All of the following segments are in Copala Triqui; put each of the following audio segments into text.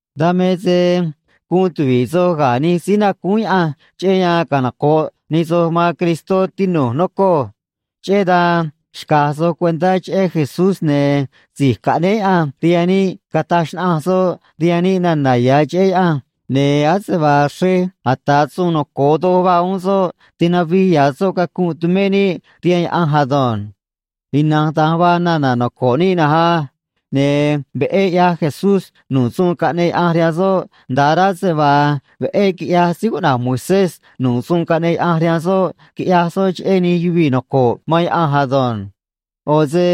Dan me se guun tuvi̱ꞌ soj ga̱ nij síí nacúún Yaꞌanj cheꞌé yan canoco̱ꞌ nij soj man Cristó, tinu̱j, nocoj. Cheꞌé dan xca̱j soj cuentá cheꞌé Jesús, ne̱ si̱j caꞌnéé Yaꞌanj rihaan níꞌ cataj xnaꞌanj soꞌ rihaan níꞌ nana̱ ya̱ cheꞌé Yaꞌanj, ne̱ ase vaa xrej ata̱ suun noco̱o doj vaa uún soꞌ, tinavij ya̱ soꞌ cacunꞌ tumé níꞌ rihaan Yaꞌanj ado̱nj. Ina̱nj da̱nj vaa nana̱ noco̱ꞌ níꞌ na̱nj á. Ne̱ veꞌé ꞌyaj Jesús nu̱ꞌ suun caꞌneꞌ Yaꞌanj rihaan soꞌ, nda̱ꞌ rá se vaa veꞌé quiꞌyaj síí cuꞌna̱j Moisés nu̱ꞌ suun caꞌneꞌ Yaꞌanj rihaan soꞌ quiꞌya̱j soꞌ cheꞌé nij yuvii̱ noco̱ꞌ man Yaꞌanj ado̱nj. ꞌO̱ se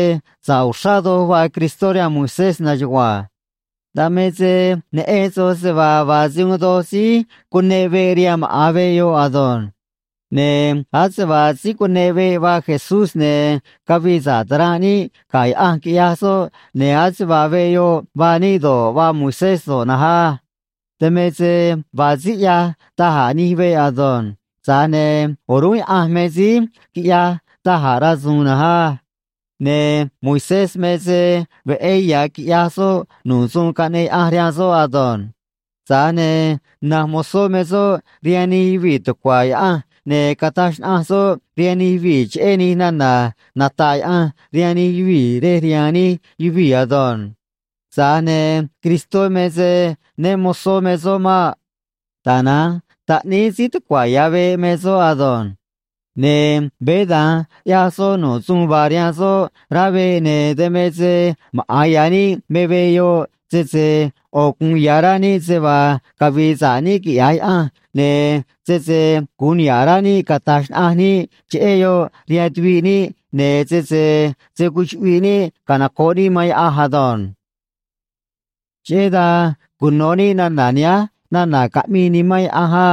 sa̱ꞌ uxrá doj vaa Cristó rihaan Moisés na̱nj chugua̱nj. Dan me se neꞌen soj se vaa vaa se uun doj síí cuneꞌ veꞌ rihaan maꞌa̱n veꞌ yoꞌ ado̱nj. Ne̱ ase vaa síí cuneꞌ veꞌ vaa Jesús, ne̱ cavii sa̱ꞌ ta̱ranꞌ níꞌ ga̱ Yaꞌanj, quiꞌyaj soꞌ, ne̱ ase vaa veꞌ yoꞌ vaa níꞌ do̱ꞌ, vaa Moisés do̱ꞌ na̱nj á. Dan me se vaa síí ꞌyaj da̱j a̱ nij veꞌ ado̱nj. Tza̱j ne̱ o̱rúnꞌ Yaꞌanj me síí quiꞌyaj da̱j a̱ rasu̱u̱n na̱nj á. Ne̱ Moisés me se veꞌé ya̱ quiꞌyaj soꞌ nu̱ꞌ suun caꞌneꞌ Yaꞌanj rihaan soꞌ ado̱nj. Tza̱j ne̱ na̱nj mozó me soꞌ rihaan nij yuvii̱ tucua̱ Yaꞌanj, ne̱ cataj xnaꞌanj soꞌ rihaan nij yuvii̱ cheꞌé nij nana̱ nata̱ꞌ Yaꞌanj rihaan nij yuvii̱ rej rihaan nij yuvii̱ ado̱nj. Tza̱j ne̱ Cristó me se né mo̱zó me soꞌ maꞌ. Tana̱nj taꞌníí síí tucua̱ ya̱ veꞌ me soꞌ ado̱nj. Ne̱ veé da̱nj ꞌyaj soꞌ nu̱ꞌ suun vaa rihaan soꞌ rá veꞌ, ne̱ dan me se maꞌa̱n ya̱ níꞌ me veꞌ yoꞌ, sese ꞌo̱ gu̱un ya̱ rá níꞌ se vaa cavi̱i̱ sa̱ꞌ níꞌ, quiꞌya̱j Yaꞌanj, ne̱ sese gu̱un niha̱ꞌ rá níꞌ cata̱j xnaꞌanj níꞌ cheꞌé yoꞌ rihaan tuviꞌ níꞌ, ne̱ sese se̱ cuchuꞌviꞌ níꞌ canoco̱ꞌ níꞌ man Yaꞌanj ado̱nj. Cheꞌé dan cuno̱ níꞌ nana̱ nihánj nana̱ caꞌmii Nimán Yaꞌanj á: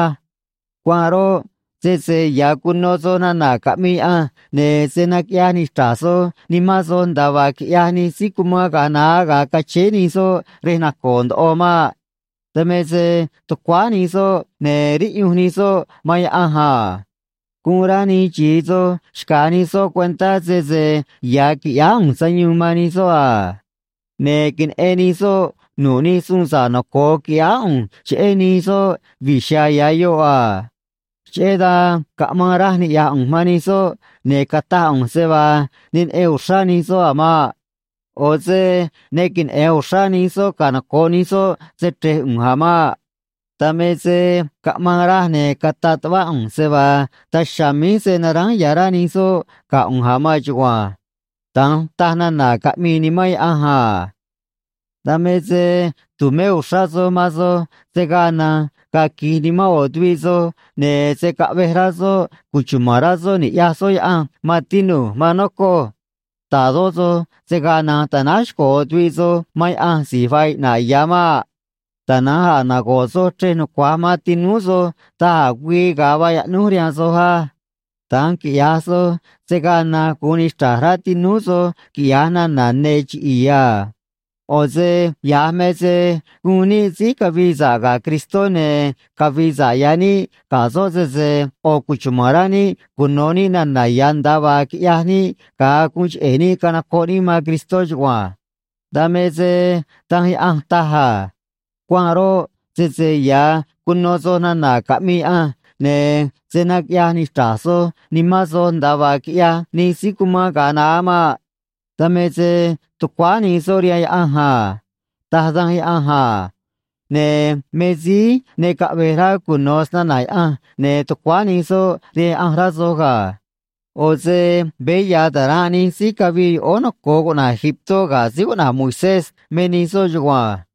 Cuanꞌ roꞌ, sese ya̱ cuno soj nana̱ caꞌmii Yaꞌanj, ne̱ se̱ naquiꞌyaj nichra̱j soj nimán soj nda̱a vaa quiꞌyaj nij síí cumán ga̱a naá ga̱a cachéé nij soꞌ rej nacoo̱ ndoꞌo maꞌ. Dan me se tucuáá nij soꞌ ne̱ riꞌyunj nij soꞌ man Yaꞌanj a. Guun rá nij xi̱i soj xca̱j nij soꞌ cuentá sese ya̱ qui̱ꞌyáá ꞌu̱nj sayuun man nij soꞌ a. Ne̱ queneꞌen nij soꞌ nu̱ꞌ nij suun sa̱ꞌ noco̱o quiꞌyáá ꞌu̱nj cheꞌé nij soꞌ vi̱j chiha̱a̱ ya̱ yoꞌ a. Cheꞌé dan caꞌmaan raj niꞌya̱j ꞌu̱nj man nij soꞌ, ne̱ cataj ꞌu̱nj se vaa ne neꞌen uxrá nij soꞌ a̱ maꞌ. ꞌO̱ se ne queneꞌe̱n uxrá nij soꞌ canoco̱ꞌ nij soꞌ se‑chre̱j ꞌu̱nj a̱ maꞌ. Dan me se caꞌmaan raj, ne̱ cataꞌ tuꞌvá ꞌu̱nj se vaa daj chiha̱a̱ míj se̱ naránj ya̱ rá nij soꞌ ga̱ ꞌu̱nj a̱ maan chugua̱nj. Da̱nj taj nana̱ caꞌmii Nimán Yaꞌanj a. Dan me se tu̱mé uxrá soj man soj se̱ gaa na̱nj ga̱a̱ qui̱j nimán ꞌo̱ tuviꞌ soj, ne̱ se̱ caꞌvej rá soꞌ cuchuma̱n rá soꞌ ni̱ꞌyaj soꞌ Yaꞌanj, maan tinu̱j, maan nocoj. Ta̱dó soj se̱ gaa na̱nj ta̱náj xco̱ ꞌo̱ tuviꞌ soj man Yaꞌanj si̱j vaa iꞌna̱ꞌ ya̱ maꞌ. Tana̱nj a̱ nago̱ꞌ soj chrej nucua̱j man tinúú soj da̱j a̱ güii ga̱a vaa yaꞌnúj rihaan soj á. Da̱nj quiꞌya̱j soj, se̱ gaa na̱nj gu̱un nichra̱j rá tinúú soj quiꞌya̱j nana̱ ne̱ chiꞌi̱i̱ a. ꞌO̱ se ya̱j me se guun níꞌ síí cavi̱i̱ sa̱ꞌ ga̱ Cristó, ne̱ cavi̱i̱ sa̱ꞌ ya̱ níꞌ ga̱ soꞌ sese ꞌo̱ cuchuma̱n rá níꞌ cuno̱ níꞌ nana̱ ya̱, nda̱a vaa quiꞌyaj níꞌ ga̱a guun cheꞌe̱ níꞌ canocoꞌ níꞌ man Cristó chugua̱nj. Dan me se Danj Yaꞌanj taj a: Cuanꞌ roꞌ, sese ya̱ cuno soj nana̱ caꞌmii Yaꞌanj, ne̱ se̱ naquiꞌyaj nichra̱j soj nimán soj nda̱a vaa quiꞌyaj nij síí cumán ga̱a naá maꞌ. Dan me se tucuáá nij soꞌ rihaan Yaꞌanj a, taj Danj Yaꞌanj a. Ne̱ me síí ne caꞌve̱j rá cuno̱ snana̱ Yaꞌanj, ne̱ tucuáá nij soꞌ rihaan Yaꞌanj, rá soj ga̱. ꞌO̱ se veé ya̱ ta̱ranꞌ nij síí cavii yoꞌóó noco̱o cuꞌna̱j Egiptó ga̱ síí cuꞌna̱j Moisés me nij soꞌ chugua̱nj.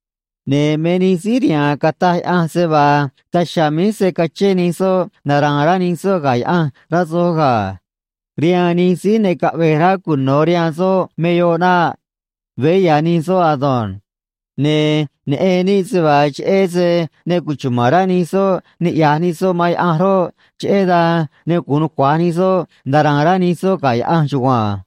Ne̱ me nij síí rihaan cataj Yaꞌanj se vaa daj chiha̱a̱ míj se̱ cachén nij soꞌ nara̱a̱n rá nij soꞌ ga̱ Yaꞌanj, rá soj ga̱. Rihaan nij síí ne caꞌve̱j rá cuno̱ rihaan soꞌ me yoꞌ naꞌ. Veé ya̱ nij soꞌ ado̱nj. Ne̱ neꞌen níꞌ se vaa cheꞌé se ne cuchuma̱n rá nij soꞌ ni̱ꞌyaj nij soꞌ man Yaꞌanj roꞌ, cheꞌé dan ne gu̱un nucua̱j nij soꞌ nara̱a̱n rá nij soꞌ ga̱ Yaꞌanj chugua̱nj.